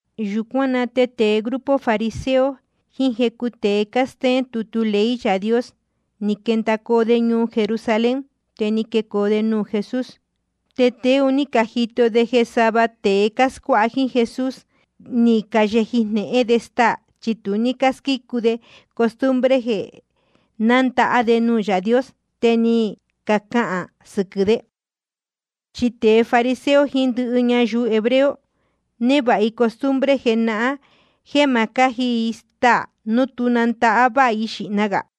Yūcuán na te tēe grupo fariseo jiín jecu tēe cástéén tutu ley Yaā Dios, ni quendacoo de ñuu Jerusalén, te ni quecoo de nuū Jesús. Te tēe un ní cajito de jeē sava tēe cáscuáha jíín Jesús, ni cayeji jnehén de staā, chi tu ní cásquícu de costumbre jeē nándahá de nuū Yaā Dios. Te ni cacahān sɨquɨ̄ de. Chi tēe fariseo jiín ndɨhɨ ñayuu hebreo, névāha i costumbre jenahán jéē ma cáji i staā núu tu nandahá váha i xīhna gā.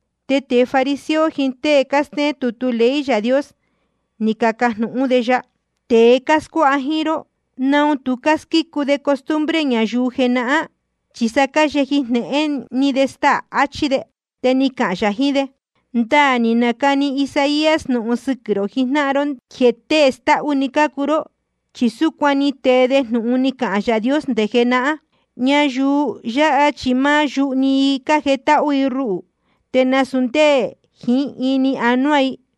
Te tēe fariseo jiín tée cástéén tutu ley Yaā Dios, ni cacajnūhún de ya: Tēe cáscuáha jíín ró, ¿naun tu cásquícu de costumbre ñayuu jenahán? Chi sa cáyeji jnehén de staā, achí de. Te ni cahān yā jiín de: Ndaā ni nacani Isaías jnūhun sɨquɨ̄ rō jijnáhan ró jéē tēe stáhú‑ni cácuu ró. Chi súcuan ni tee de jnūhun ni cahān Yaā Dios nde jenahán: Ñayuu yáha chi máá yuhu‑ni i cájetáhú i ruhū, te nasūu ndé jiín ini jiín ánuá i.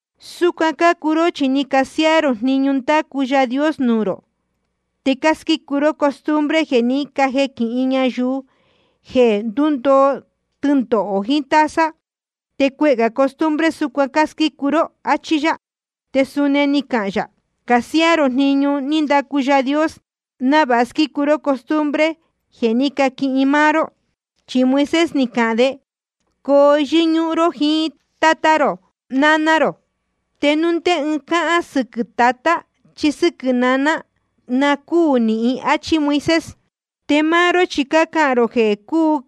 Súcuan cácuu ró, chi ni casiáá rō jniñu ní ndacu Yaā Dios nuū rō, te cásquícu ró costumbre jeē ní cajequin ñayuu, jeē ndúndoo tɨndohō jiín taza. Te cuehē gā costumbre súcuan cásquícu ró, áchí yá. Te suni ni cahān yā: Cásiáá rō jniñu ní ndacu Yaā Dios, návāha squícu ró costumbre ni cajequin máá ró. Chi Moisés ni cahān de: Coo yɨ́ñúhún ró jiín tátá rō jiín náná rō. Te núu ndé ɨɨn cahān sɨquɨ̄ tatá chí sɨ́quɨ̄ naná, na cúū nahín. Achí Moisés. Te máá ró chi cácahān rō jeē cuu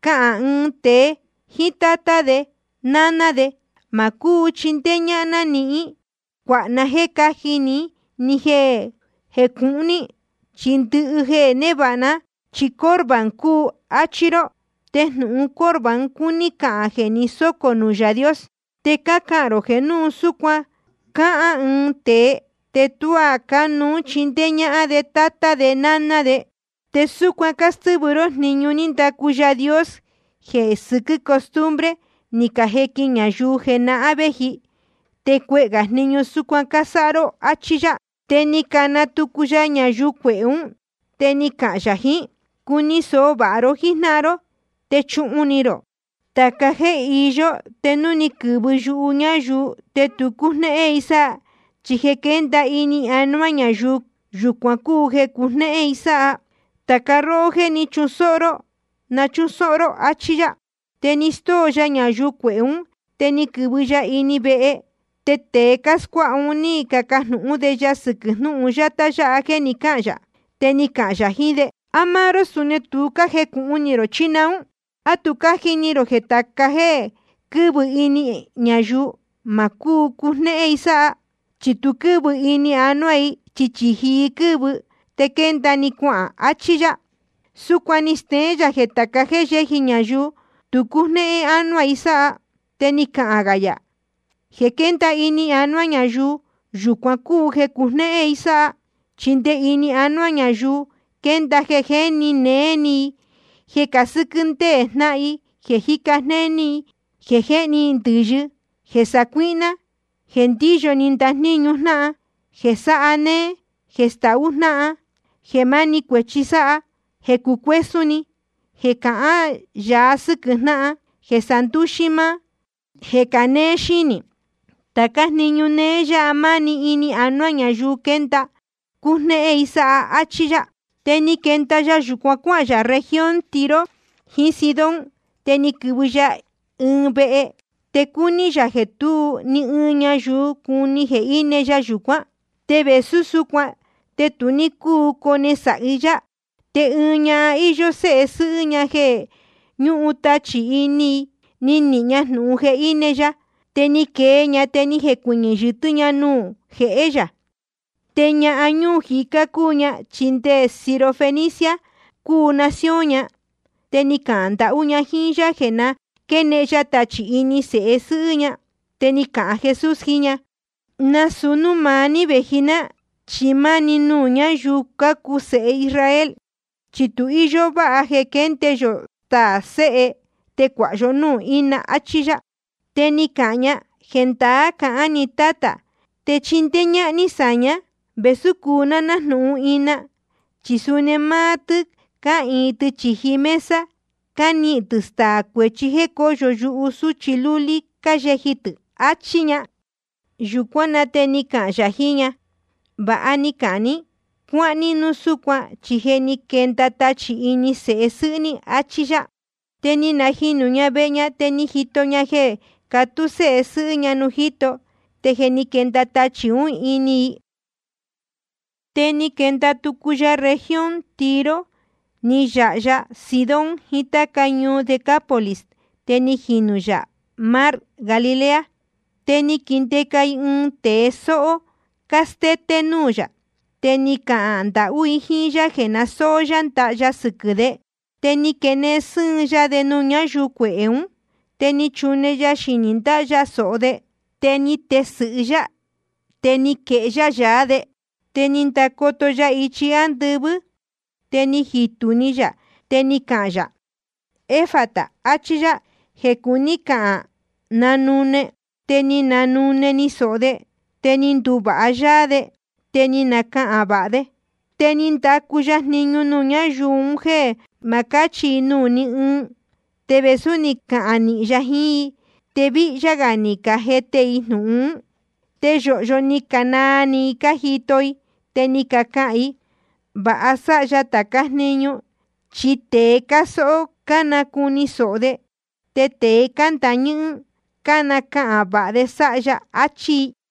cahān ɨɨn tēe jíín tátá de náná de: Ma cúu chindéé ñáhán ná níhín cuáha na jéē cáji ni jéē cúhun ní, chi ndɨhɨ jeē névāha ná, chi Corbán cúu, áchí ró. (Te jnūhun Corbán cuní cahān jeē ni sócō nuū Yaā Dios.) Te cácahān rō jeē núu súcuan cahān ɨɨn tēe, te tuá cánuú chindéé ñáhán de tátá de náná de. Te súcuan cástɨ́vɨ ró jniñu ní ndacu Yaā Dios, jeē sɨquɨ́ costumbre ni cajequin ñayuu jenahán vēji. Te cuehē gā jniñu súcuan cásáha ró, áchí yá. Te ni cana tucu ya ñayuu cuehē ún, te ni cahān yā jiín i: Cuni sōho vāha ró jíjnáhan ró, te chuhun ni rō: Tāca jéē iyó, te núu ni quɨ̄vɨ yuhu ñayuu te tu cújnéhén i sáha. Chi jeē quénda ini anuá ñayuu, yūcuan cúu jeē cujnéhén i sáha. Tāca róhó jéē jíni sōho, na chúsóhó ró, áchí yá. Te ni stóo ya ñayuu cuehē ún, te ni quɨ̄vɨ ya ini vehe. Te tēe cáscuáha ún, ni cacajnūhún de ya sɨquɨ̄ jnúhun yátá yáha jéē ni cáhān yā. Te ni cahān yā jiín de: ¿A máá ró suni ná tu jecūhun ni rō, chí naún? ¿A tu cájini rō jeē tāca jéē quɨ́vɨ ini ñayuu, ma cúu cujnéhén i sáha? Chi tu quɨ́vɨ ini anuá i, chi chīji i quɨ́vɨ, te quénda‑ni cuahān, achí yá. Súcuan ni steén yā jeē tāca jéē yéji ñayuu, tu cújnéhén ánuá i sáha. Te ni cahān gā yā: Jeē quénda ini anuá ñayuu, yūcuan cúu jeē cujnéhén i sáha. Chi nde ini anuá ñayuu quénda jeē jéni néé ni, jeē casɨ́quɨ́ ndéē jnáhan, jeē jíca jnéní, jeē jéhni ndɨ̄yɨ, jeē sacuíhná, jeē ndíyo ni ndajníñu jnáhan, jeē sáha néé, jeē stahú jnáhan, jeē máni cuēchi sáha, jeē cucuésún ni, jeē cahán yāa sɨ́quɨ̄ jnáhan, jeē sandúxí máá, jeē canéé xínī. Tācá jniñu néé yáha, máni ini anuá ñayuu quénda, te cújnéhén i sáha, áchí yá. Te ni quenda ya yūcuan cuáhān yā región Tiro jiín Sidón. Te ni quɨ̄vɨ ya ɨɨn vehe, te cúní yā jeē tú ni ɨɨn ñayuu cuni jeē íne ya yūcuán. Te vēsú súcuan, te tu ní cúu cone sāhi yá. Te ɨɨn ñahan íyó séhe sɨ́hɨ́ ña jeē ñúhun tachī ini i, ni nihīn‑ni ña jnūhun jeē íne ya. Te ni quee ña, te ni jecuɨñɨ̄ yɨtɨ́ ña nuū jehé yā. Te ñahan ñuu jicá cúu ña, chi nde Sirofenicia cúu nación ña. Te ni cahān ndahú ña jíín yá jeē na quénehen ya tachī ini sēhe sɨ́hɨ́ ña. Te ni cahān Jesús jiín ña: Nasūu núū maá ní vēji ná, chi máni nuū ñáyuu cácuu sēhe Israel. Chi tu íyó váha jeē quénde yō staā sēhe te cuāha yó núū ína, achí yá. Te ni cahān ña: Jendaá cahán ni Tátā, te chindéé ñáhán ní sáña vēsú cúu ná nájnūhun ina. Chi suni máá tɨ́ cáhīin tɨ chīji mesa, cánihīn tɨ̄ staā cuechí jéē cóyo yuhu sūchi lúlí cáyeji tɨ̄, achí ña. Yūcuán na te ni cahān yā jiín ña: Vāha ni cahān ní. Cuáhán ní núu súcuan, chi je ni quenda tachī ún ini sēhe sɨ́hɨ́ ní, achí yá. Te ni najinū ña vehe ña, te ni jito ña jeē catú sēhe sɨ́hɨ́ ña nuū jíto, te je ni quenda tachī ún ini i. Te ni quenda tucu ya región Tiro, ni yāha ya Sidón jiín táca ñuu Decápolis, te ni jinū yā mar Galilea. Te ni caquindeca i ɨɨn tēe sóhó cástété nuū yā, te ni cacahān ndahú i jíín yá jeē na sóó yá ndaha ya sɨquɨ̄ de. Te ni quenehen sɨ́ɨn ya de nuū ñáyuu cuehē ún, te ni chune ya xinī ndáha ya sōho de, te ni tesɨ̄hɨ yá, te ni quehé yá yaá de. Te ni ndacoto ya ichi ándɨvɨ́, te ni jitū ni yā, te ni cahān yā: Efata, achí yá, jeē cuní cahān: Nanune. Te ni nanune‑ni sōho de, te ni nduvāha yáá de, te ni nacahān vāha de. Te ni ndacu ya jniñu nuū ñáyuu un jéē ma cáchi i nuū ní ɨɨn. Te vēsú ni cahān nīhin ya jiín i, te víhyá gā ni cajete i jnūhun. Te yōhyo ni canaa ni i cájito i, te ni cacahān i: Vāha sáha ya tācá jniñu, chi nde tēe cásóhó, cánacuni sōho de, te tēe cándāa ñɨ́hɨ́n, cánacahān vāha de sáha ya, achí i.